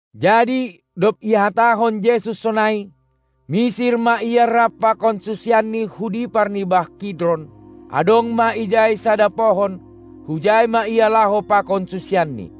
Jadi dob ihatahon Jesus sonai, misir ma Ia rap pakon susianNi hu dipar ni bah Kidron. Adong ma ijai sada pohon, hujai ma Ia laho pakon susianNi.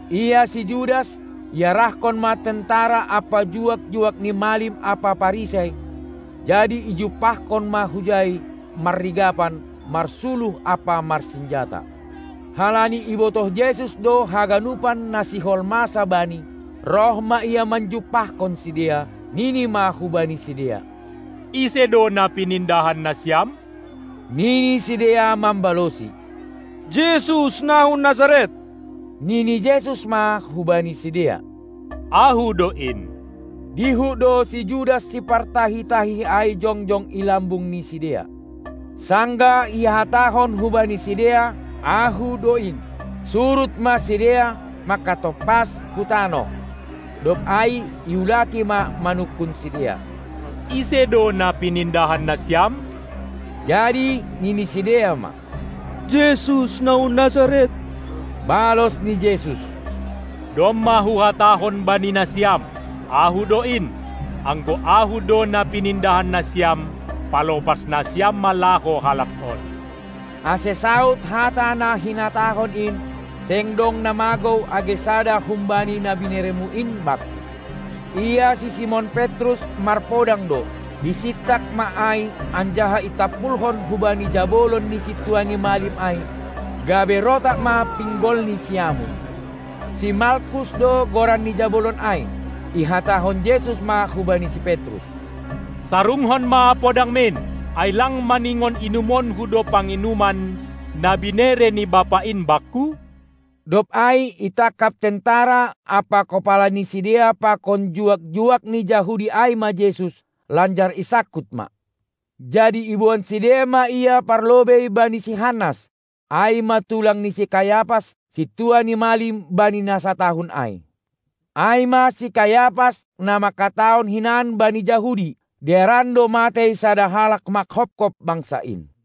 Ia si Judas, iarahkon ma tentara ampa juak-juak ni malim ampa Parisei, jadi ijumpahkon ma hujai, marrigapan, marsuluh ampa marsinjata. Halani ibotoh Jesus do haganupan na sihol masa Bani, roh ma Ia manjumpahkon sidea, nini ma hubani sidea: Ise do na pinindahan nasiam? Nini sidea mambalosi: Jesus, na hun Nazaret! Nini Jesus ma hubani sidea: Ahu do in! Dihut do si Judas sipartahi-tahi ai jongjong i lambung ni sidea. Sanggah ihatahon hubani sidea: "Ahu do in", surut ma sidea mangkatompas hu tanoh. Dob ai iulaki ma manungkun sidea: Ise do na pinindahan nasiam? Jadi nini sidea ma: Jesus na hun Nazaret! Balos ni Jesus: Domma Huhatahon bani nasiam: Ahu do in! Anggo Ahu do na pinindahan nasiam, palopas nasiam ma laho halak on. Ase saud hata na hinatahon in: Seng dong na magou age sada humbani na binereMu in Bakku. Ia si Simon Petrus marpodang do, isintak ma ai anjaha itampulhon hubani jabolon ni sintua ni malim ai, gabe rotap ma pinggolni siamun. Si Malkus do goran ni jabolon ai. Ihatahon Jesus ma hubani si Petrus: Sarungkon ma podangmin! Ai lang maningon inumonku do panginuman, na binere ni Bapa in Bakku? Dob ai itangkap tentera ampa kopala ni sidea pakon juak-juak ni Jahudi ai ma Jesus, lanjar isangkut ma. Jadi iboan sidea ma Ia parlobei bani si Hannas, ai ma tulang ni si Kayapas, sintua ni malim bani na satahun ai. Ai ma si Kayapas, na mangkatahon hinan bani Jahudi: Dearan do matei sada halak mangkopkop bangsa in.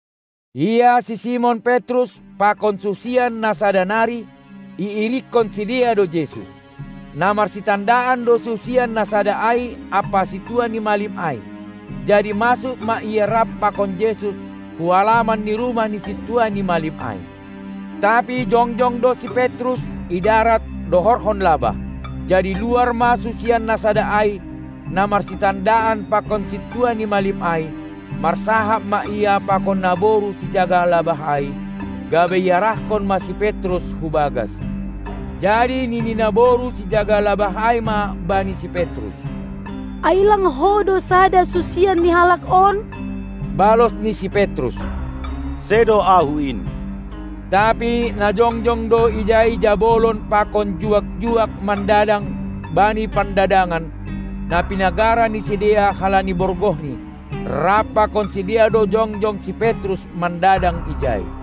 Ia si Simon Petrus pakon susian na sada nari, iirikkon sidea do Jesus. Na marsitandaan do susian na sada ai ampa sintua ni malim ai, jadi masuk ma ia rap pakon Jesus hu alaman ni rumah ni sintua ni malim ai. Tapi jongjong do si Petrus i darat dohorhon labah. Jadi luar ma susian na sada ai, na marsitandaan pakon sintua ni malim ai, marsahap ma ia pakon naboru sijaga labah ai, gabe iarahkon ma si Petrus hu bagas. Jadi nini naboru sijaga labah ai ma bani si Petrus: Ai lang ho do sada susian ni halak on? Balos ni si Petrus: Sedo ahu in! Tapi na jongjong do ijai jabolon pakon juak-juak mandadang bani pandadangan, na pinagara ni sidea halani borgohni. Rap pakon sidea do jongjong si Petrus mandadang ijai.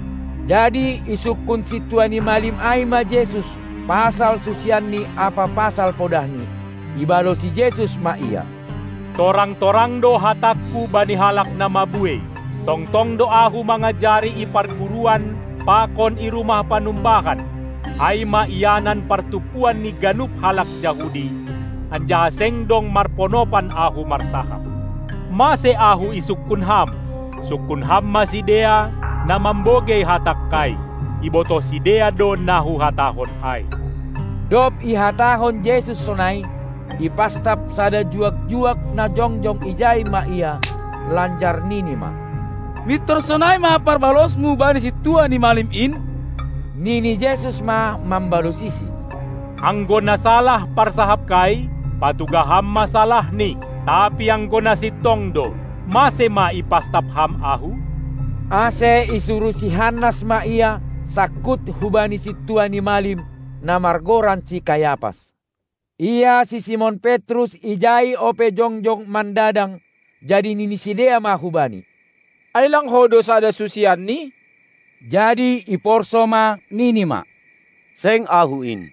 Jadi isungkun sintua ni malim ai ma Jesus pasal susianNi ampa pasal podahni. Ibalosi Jesus ma ia: Torang-torang do hatangKu bani halak na mabuei. Tongtong do Ahu mangajari i parguruan pakon i rumah panumbahan, ai ma ianan partumpuan ni ganup halak Jahudi, anjaha seng dong marponopan Ahu marsahap. Mase Ahu isungkun Ham? Sungkun Ham ma sidea, na mambogei hatangKai! Ibotoh sidea do na Huhatahon ai. Dob ihatahon Jesus sonai, ipastap sada juak-juak na jongjong ijai ma Ia, lanjar nini ma: Mintor sonai ma parbalosMu bani sintua ni malim in? Nini Jesus ma mambalosisi: Anggo na salah parsahapKai, patugah ham ma salahni, tapi anggo na sintong do, mase ma ipastap ham Ahu? Ase isuruh si Hannas ma Ia sangkut hubani sintua ni malim, na margoran si Kayapas. Ia si Simon Petrus ijai ope jongjong mandadang. Jadi nini sidea ma hubnai: Ai lang ho do sada susianNi? Jadi iporsou ma nini ma: Seng ahu in!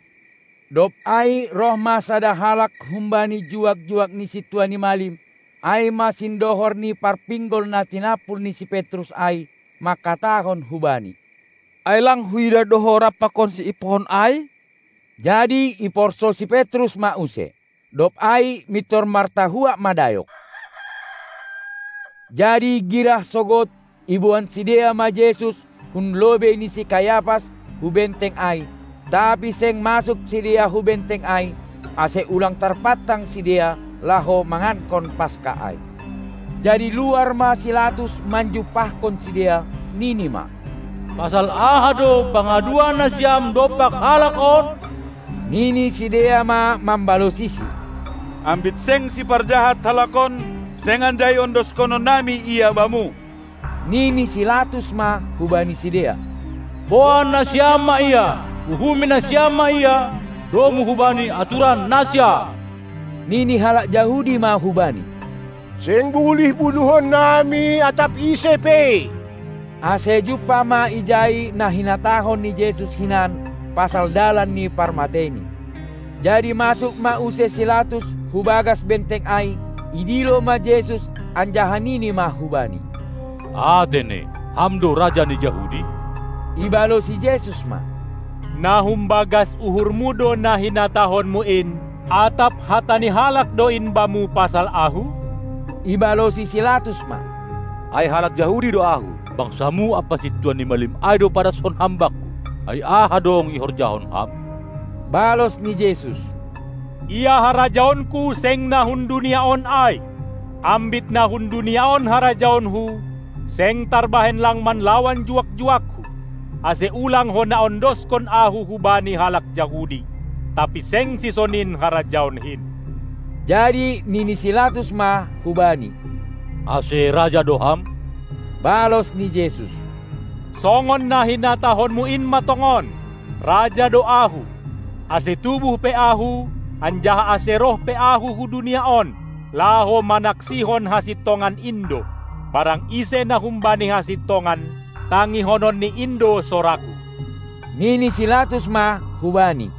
Dob ai roh ma sada halak humbani juak-juak ni sintua ni malim, ai ma sindohor ni parpinggol na tinampul ni si Petrus ai, mangkatahon hubani: Ai lang huidah do ho rap pakonsi i pohon ai? Jadi iporsou si Petrus ma use, dob ai mintor martahuak ma dayok. Jadi girah sogod, iboan sidea ma Jesus hun lobei ni si Kayapas, hu benteng ai. Tapi seng masuk sidea hu benteng ai, ase ulang tarpantang sidea, laho mangankon Paska ai. Jadi luar ma si Latus manjumpahkon sidea, nini ma: Pasal aha do pangaduan nasiam dompak halak on? Nini sidea ma mambalosisi: Ambit seng siparjahat halak on, seng anjai ondoskonon nami Ia bamu. Nini si Latus ma hubani sidea: Boan nasiam ma Ia, uhumi nasiam ma Ia domu hubani aturan nasiam. Nini halak Jahudi ma hubani: Seng bulih bunuhon nami atap ise pe. Ase jumpah ma ijai na hinatahon ni Jesus hinan pasal dalan ni parmateiNi. Jadi masuk ma use si Latus hu bagas benteng ai, idilo ma Jesus anjaha nini ma hu-Bani: Atene, Ham do Raja ni Jahudi? Ibalosi Jesus ma: Na humbagas uhurmu do na hinatahonmu in, atap hata ni halak do in bamu pasal Ahu? Ibalosi si Latus ma: Ai halak Jahudi do ahu? BangsaMu ampa sintua ni malim ai do padashon Ham bakku. Ai aha dong ihorjahon Ham? Balos ni Jesus: Ia harajaonKu seng na hun dunia on ai. Ambit na hun dunia on harajaonKu, seng tarbahen lang manlawan juak-juakKu, ase ulang hona ondoskon Ahu hubani halak Jahudi; tapi seng sisonin harajaonKin! Jadi nini si Latus ma hu-Bani: Ase raja do Ham? Balos ni Jesus: Songon na hinatahonmu in ma tongon. Raja do Ahu! Ase tubuh pe Ahu, anjaha ase roh pe Ahu hu dunia on, laho manaksihon hasintongan in do. Barang ise na humbani hasintongan, tangihononni in do sorangKu. Nini si Latus ma hu-Bani: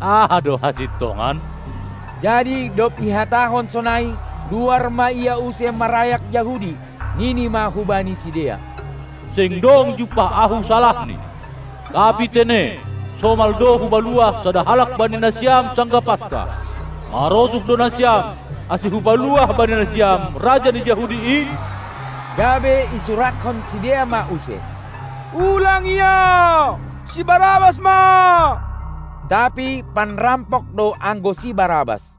Aha do hasintongan? Jadi dob ihatahon sonai, luar ma ia use marayak Jahudi, nini ma hubani sidea: Seng dong jumpah ahu salahni! Tapi tene, somal do hupaluah sada halak bani nasiam sanggah Paska. Marosuh do nasiam, ase hupaluah bani nasiam Raja ni Jahudi in? Gabe isurakkon sidea ma use: Ulang Ia! Si Barabas ma! Tapi panrampok do anggo si Barabas.